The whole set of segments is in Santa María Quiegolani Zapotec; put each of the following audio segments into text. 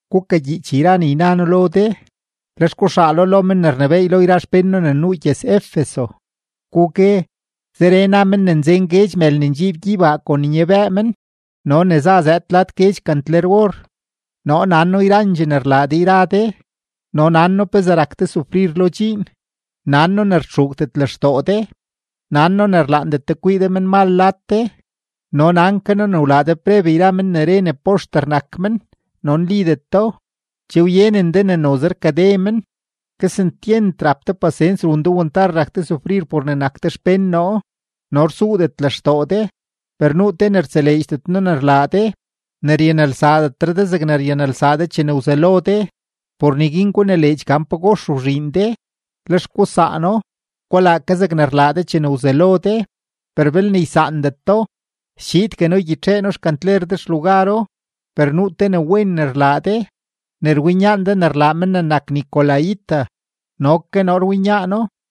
’Gukagyiich yra ne yna noo lo de, lex guxaalo lo men ne rnebééy lo yra xpén noo ne nuu gyëz-Efeso, gugue: “Zeree na men ne nzen guedx mël ne ndxiib gyeybaa kon nyabëë men no ne za zëëd lad guedx kantler-or: Noo nan noo yrandxee ne rlaa de yra de, no nan noo pezee rak de sufrir lo dxiin, nan noo ne rtxuugdet lextoo de, nan noo ne rlaandet de kwii de menmal lad de, no nan ke noo ne wlaa de preb yra men ne re poxter nak men no nlideto, che wyenen de ne noze rkade men. Kesentyent rap de pasens, run de wantar rak de sufrir por ne nak de xpén noo, no rsuudet lextoo de. Per nuu te ne rtseleedxdet noo ne rlaa de: ne ryanelsaadetre de zegne ryanelsaa de chene wzelo de. Por neguin gunileedx gan pagox wzhiin de, lex gusaano; gulaa ke zegne rlaa de chene wzelo de; per belne ysaandet do, schiidgue noo ygyitxee noo xkantler de xlugaro. Per nuu te ne wen ne rlaa de: ne rwinyaan de ne rlaa men ne nak nicolaíta, no ke noo rwinyaano.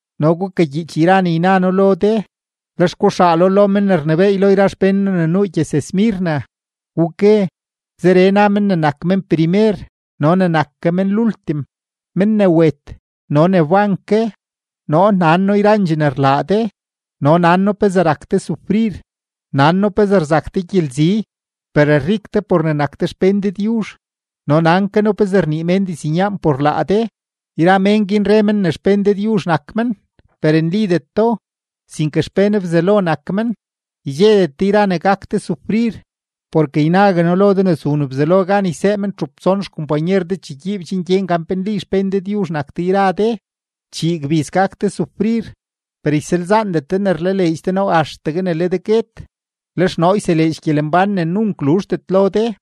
’No gukagyiich yra ne yna noo lo de, lex guxaalo lo men ne rnebééy lo yra xpén noo ne nuu gyëz-Esmirna, gugue: “Zeree na men ne nak men primer no ne nak ke men lultim, men ne wet no ne wban ke: Noo nan noo yrandxee ne rlaa de, no nan noo pezee rak de sufrir, nan noo pezee rzak de gyelzi, per rik de por ne nak de xpén Dëdyuzh, no nan ke noo pezee rnii mén diznyaan por laa de; yra mén guin re men ne xpén Dëdyuzh nak men, per nlideto, sinke xpén Bzelo nak men. Ydxedet de yra ne gak de sufrir. Porke ynague noo lo de ne zun Bzelo gan ysee mén txup tson xkompanyer de chegyiib chen gyen gan pe nli xpén Dëdyuzh nak de yra de, chii gbiz gak de sufrir. Per ysalzaandet de ne rlaleedx de noo axtegue ne le de guet, lex noo yseleedx gyelembán ne nunk luzhdet lo de.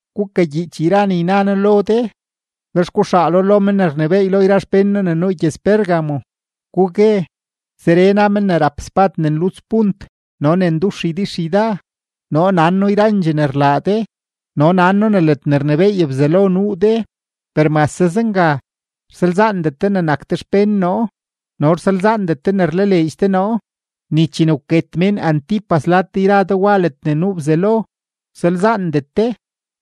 ’Gukagyiich yra ne yna noo lo de, lex guxaalo lo men ne rnebééy lo yra xpén noo ne nuu gyëz-Pérgamo, gugue: “Zeree na men ne rap spad ne nluts punt no ne ndux ydixyda: Noo nan noo yrandxee ne rlaa de, no nan noo ne ledne rnebééy Bzelo nuu de, per mase zenga, rsalzaandet de nak de xpén noo no rsalzaandet de ne rlaleedx de noo; ni chene wket mén Antipas lad de yra de wa ledne nuu Bzelo, wsalzaandet de,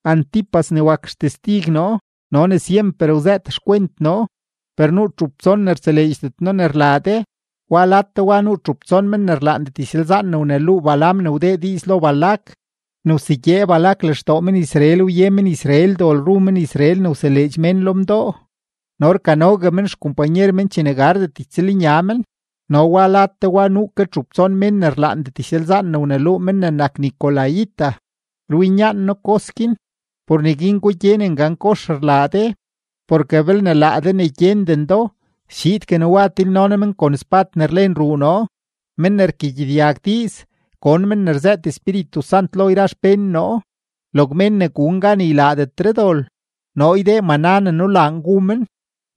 Antipas ne wak xtestig noo no ne syemper wzëët xkwent noo. Per nuu txup tson ne rtseleedxdet noo ne rlaa de: wa lad de wa nuu txup tson mén ne rlaandet ysalzaan ne wneluu Balaam ne wdee diiz lo Balac ne wsegyee Balac lextoo men-Israel wye men-Israel dol ru men-Israel ne wseleedx mén lo mdoo no rkanogue men xkompanyer men chene gardet ytsëlnya men. No wa lad de wa nuu ke txup tson mén ne rlaandet ysalzaan ne wneluu men ne nak nicolaíta; rwinyaan noo kos guin. Por neguin gugyenen gan kox rlaa de, porke belne laa de ne gyenden do, schiidgue noo wa tilno noo men kon spad ne rlen ruu noo. Men ne rkagyedyag diiz, gon men ne rzëët Espíritu Sant lo yra xpén noo: Log mén ne gun gan ne ylaadetre dol, noo ydee maná ne nulaan gu men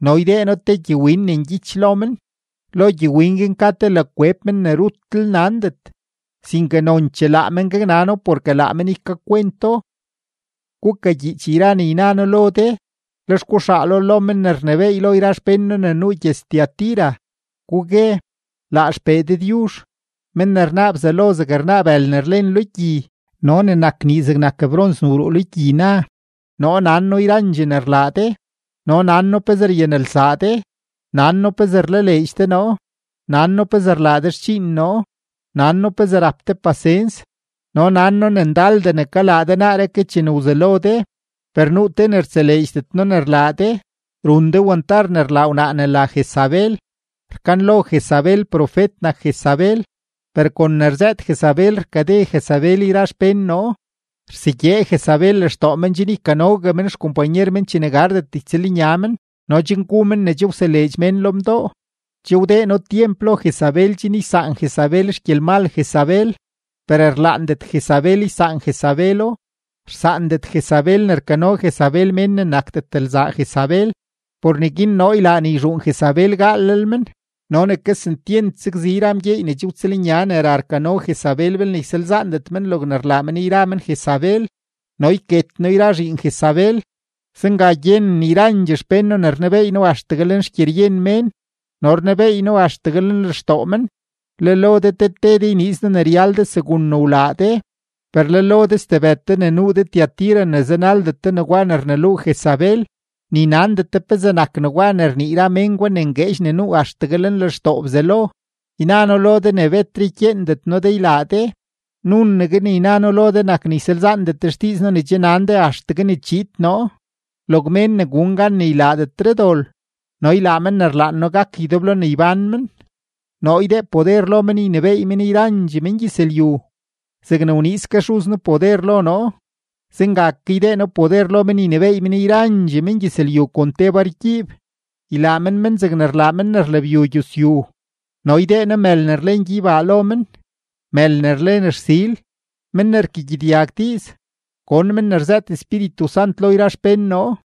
no ydee noo te gyewin ne ngyich lo men; lo gyewin guin ka te la kweb men ne rutlel nandet, sinke nonchee laa men gaknano porke laa men ykakwento.” ’Gukagyiich yra ne yna noo lo de, lex guxaalo lo men ne rnebééy lo yra xpén noo ne nuu gyëz-Tiatira, gugue: “Laa XPee Dëdyuzh, men ne rnaa bzalo zeg rnaa bël ne rlen lo gyi no ne nak nii zegnak brons ne wruu lo gyi na: Noo nan noo yrandxee ne rlaa de, no nan noo pezee ryanelsaa de, nan noo pezee rlaleedx de noo, nan noo pezee rlaa de xdxiin noo, nan noo pezee rap de pasens, no nan noo ne ndaldee ne kalaa de naaree ke chene wzelo de. Per nuu te ne rtseleedxdet noo ne rlaa de: run de wantar ne rlaa wnaa ne la Jezabel; rkanlo Jezabel profet nak Jezabel, per kon ne rzëët Jezabel rkade Jezabel yra xpén noo, rsegyee Jezabel lextoo men chen ykanogue men xkompanyer men chene gardet ytsëlnya men no chen gu men ne che wseleedx mén lo mdoo. Che wdee noo tyemp lo Jezabel chen ysaan Jezabel xgyelmal Jezabel, per rlaandet Jezabel ysaan Jezabelo: rsaandet Jezabel ne rkano Jezabel mén ne nakdet lzaa Jezabel. Por neguin noo ylaa ne yzhuun Jezabel gaalel men no ne kesentyent sakzi yra mgyeey ne che wtsëlnya ne ra rkano Jezabel belne ysaandet men logne rlaa men yra men Jezabel, no yket noo yra zhiin Jezabel. Zenga gyenen yrandxee xpén noo ne rnebeey noo axtegue lenxgyeryen mén no rnebeey noo axtegue lenlextoo men; le lo de te te de yniiz noo ne ryal de segun ne wlaa de. Per le lo de stebëd de ne nuu de Tiatira ne zanaldet de negwa ne rneluu Jezabel, ni nandet de pezee nak negwa ne rnii yra men gwa ne ngueedx ne nuu axtegue lenlextoo Bzelo, yna noo lo de ne betre ykyeendet noo de ylaa de. Nunegue ne yna noo lo de nak ne ysalzaandet de xdiiz noo ne che nan de axtegue ne chiid noo. Log mén ne gun gan ne ylaadetre dol no ylaa men ne rlaan noo gak ydeblo ne ybán men, noo ydee poder lo men ynebééy men yrandxee mengyëzlyu. Zegne wniiz ke Xuz noo poder lo noo, zenga ke ydee noo poder lo men ynebééy men yrandxee mengyëzlyu kon te bargyiib; ylaa men men zegne rlaa men ne rlabyu gyusyu. No ydee noo mël ne rlen gyeybaa lo men, mël ne rlen rsil. Men ne rkagyedyag diiz, gon men ne rzëët Espíritu Sant lo yra xpén noo.”